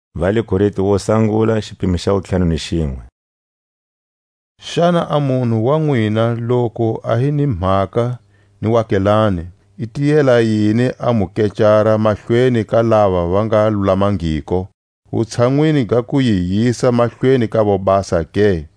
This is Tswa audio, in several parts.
Mu nga kecarani timhakeni. Xana a munhu wa nwina loku a hi ni mhaka ni waakelane, i tiyela yini a mu kecara mahlweni ka lava va nga lulamangiko, wutshanwini ga ku yi yisa mahlweni ka vobasa ke?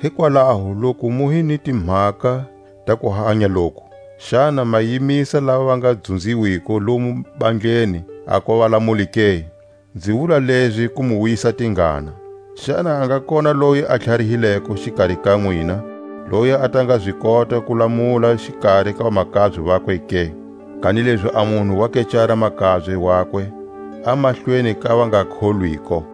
Hikwalaho loku mu hi ni timhaka ta kuhanya loku, xana ma yimisa lava va nga dzunziwiko lomu bandleni a kuva valamuli ke? Nzi wula lezi ku mu wisa tingana. Xana a nga kona loyi a tlharihileko xikari ka nwina, loyi a ta nga zi kota ku lamula xikari ka vamakabye vakwe ke? Kanilezi a munhu wa kecara makabye wakwe a mahlweni ka vangakholwiko!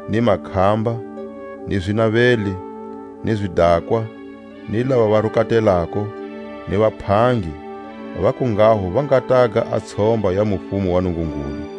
ni makhamba, ni zinaveli, ni zidakwa, ni lava va rukatelako, ni vaphangi; a va kunghaho va nga taga a tshomba ya mufumo wa Nungungulu.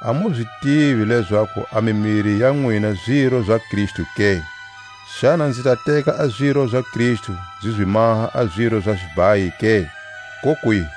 A mu zi tivi lezaku a mimiri ya nwina ziro za Kristu ke? Xana nzi ta teka a ziro za Kristu nzi zi maha a ziro za xibhayi ke? Kokwihi!